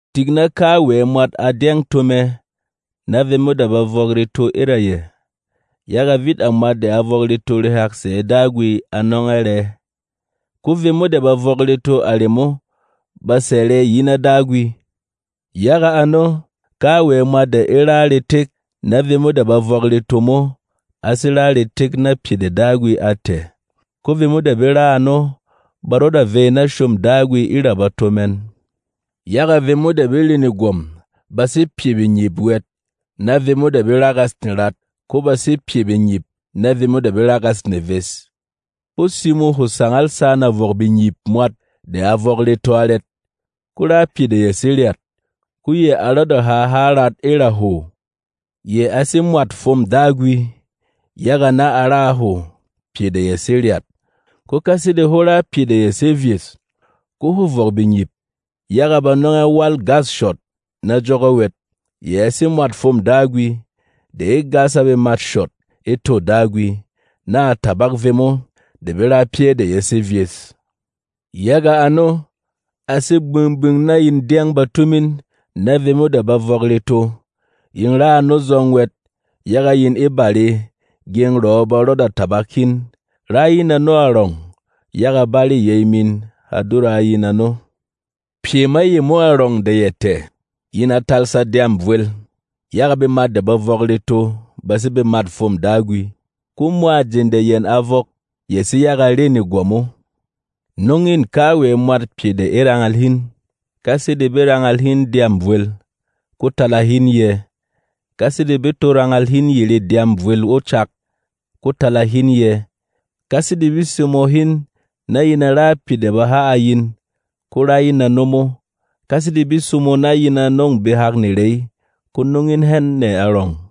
Tik na kawɛ mwat a dyɛng to mɛ na vemo de ba vɔk reto e ra yɛ. Yaga vit a mwat de a vɔk reto rehak sɛ̌ Dagwi a nɔng ɛ rɛ. Ko vemo de ba vɔk reto a remo ba sɛ̀ rɛ yi na Dagwi. Yaga ano, kawɛ mwat de e ra retek na vemo de ba vɔk reto mo a sé ra retek na pyɛ de Dagwi a tɛ̀. Ko vemo de be ra ano ba rɔda vey na shôm Dagwi e ra bato mɛn. Yaga vemo de be re negwɔm ba sé pyɛ bengyip wɛt na vemo de be ragas nerat. Ko ba sé pyɛ bengyip na vemo de be ragas neves. Hwó simo hwo sangal sana vɔk bengyip mwat de a vɔk reto arɛt? Ko rá pyɛ de ya sé ryat, ko yɛ a rɔda ha há rat e ra hwo. Yɛ a sé mwât fwôm Dagwi, yaga na a ra a hwo pyɛ de ya sé ryat. Ko ka sede hwó ra pyɛ de ya sé vyes, ko hwô vɔk bengyip, yaga ba nɔng ɛ wâl gâs shɔt na jɔgɔ wɛt. Yɛ a sé mwât fwôm Dagwi, de e gas a bemat shɔt e tô Dagwi, na a tabak vemo de be ra pyɛ́ de ya sé vyes. Yaga ano, a sé gbing-gbing na yin dyɛng bato min na vemo de ba vɔk reto. Yin ra ano zɔng wɛt, yaga yin e bare, gyeng rɔ̌ ba rɔda tabak hin. Rá in ano arɔng, yaga bare yey min ha dura a yin ano. Pyɛ ma yemo arɔng de ya tɛ̀, yin a talsa dyâm vwel. Yaga bemat de ba vɔk reto ba sé bemât fwôm Dagwi, ko mwa jeng de yɛn a vɔk ya sé yaga rê negwɔm o. Nɔng în kawɛ mwat pyɛ de e rangal hin: Ka sede be rangal hin dyâm vwel, ko tala hin yɛ̄. Ka sede be to rangal hin yerê dyâm vwel o cak, ko tala hin yɛ̄. Ka sede be simo hin na yin a ra pyɛ de ba ha a yin, ko rá in ano mo. Ka sede be simo na yin a nɔ̂ng behak nerey, ko nɔng in hɛn nɛ arɔng.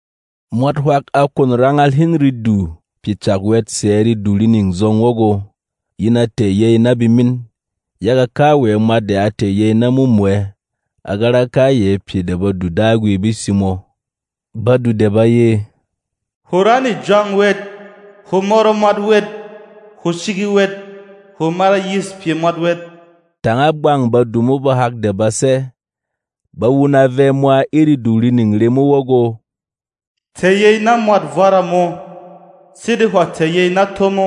Mwat hwak a kwon rangal hin redu pyɛ cak wɛt sɛ̌ redu rining zɔng wɔgɔ, yin a tɛ̀ yey na bemin. Yaga kawɛ mwat de a tɛ̀ yey na mumwɛ a ga ra kayɛ pyɛ de Badu Dagwi be simo. Badu de ba ye, “Hwo ra nejwang wɛt; hwo mɔrɔ mwat wɛt; hwo shigi wɛt; hwo mara yîs pyɛ mwat wɛt”, tanga bwang badu mo bahak de ba sɛ́ — ba wuna vɛ mwa e redu rining remo wɔgɔ, “Tɛ̀ yey na mwât vwara mō, sede hwà tɛ̀ yey na tó mo.”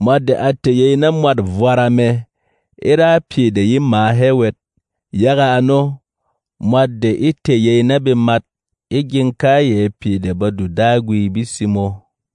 Mwat de a tɛ̀ yey na mwât vwara mɛ e rá pyɛ de ye mǎ hɛ wɛt. Yaga ano, mwat de e tɛ̀ yey na bemat e gyeng kayɛ pyɛ de Badu Dagwi be simo.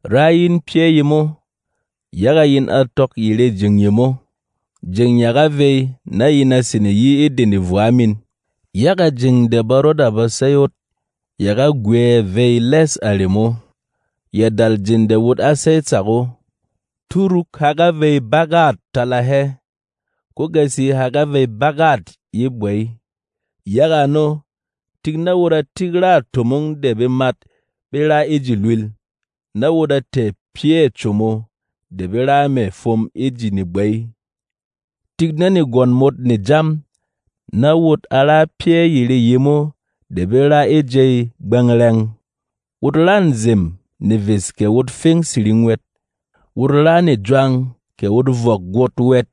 Rá in pyɛ́ yemo, yaga yin a tɔk yerê jeng yemo. Jeng ya ga vey na yin a sene yi e de nevwa min. Yaga jeng de ba rɔda ba sey ot ya ga gwɛ̌ vey lɛ́s a remo, ya dal jeng de wot á sey tsak o. Túruk ha ga vey bagât tala hɛ, ko gasi ha ga vey bagât ye gbey. Yaga ano, tik na wot a tik râ tomong de bemat be ra e ji lwīl, na wot a tɛ̀ pyɛ̂ como de be ra mɛ̀ fwom e ji negbey. Tik na negwɔn mot ne jam, na wot a ra pyɛ́ yerê yemo de be ra e jey gbɛngɛrɛng. Wot ra nzem neves kɛ wot feng siring wɛt; wot ra nejwang kɛ wot vɔk gwōt wɛt;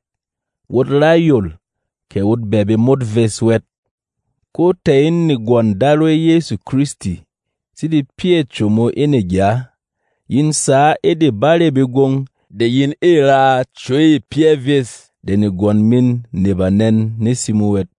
wot ra yol kɛ wot bɛɛ bemot ves wɛt. Ko tɛ̀ in negwɔn Darwey Yɛsu Kristi sede pyɛ̂ como e negya. Yin sǎ e de barê begwong de yin ê raa cwey pyɛ́ vyes de negwɔn min ne banɛn ne simo wɛt.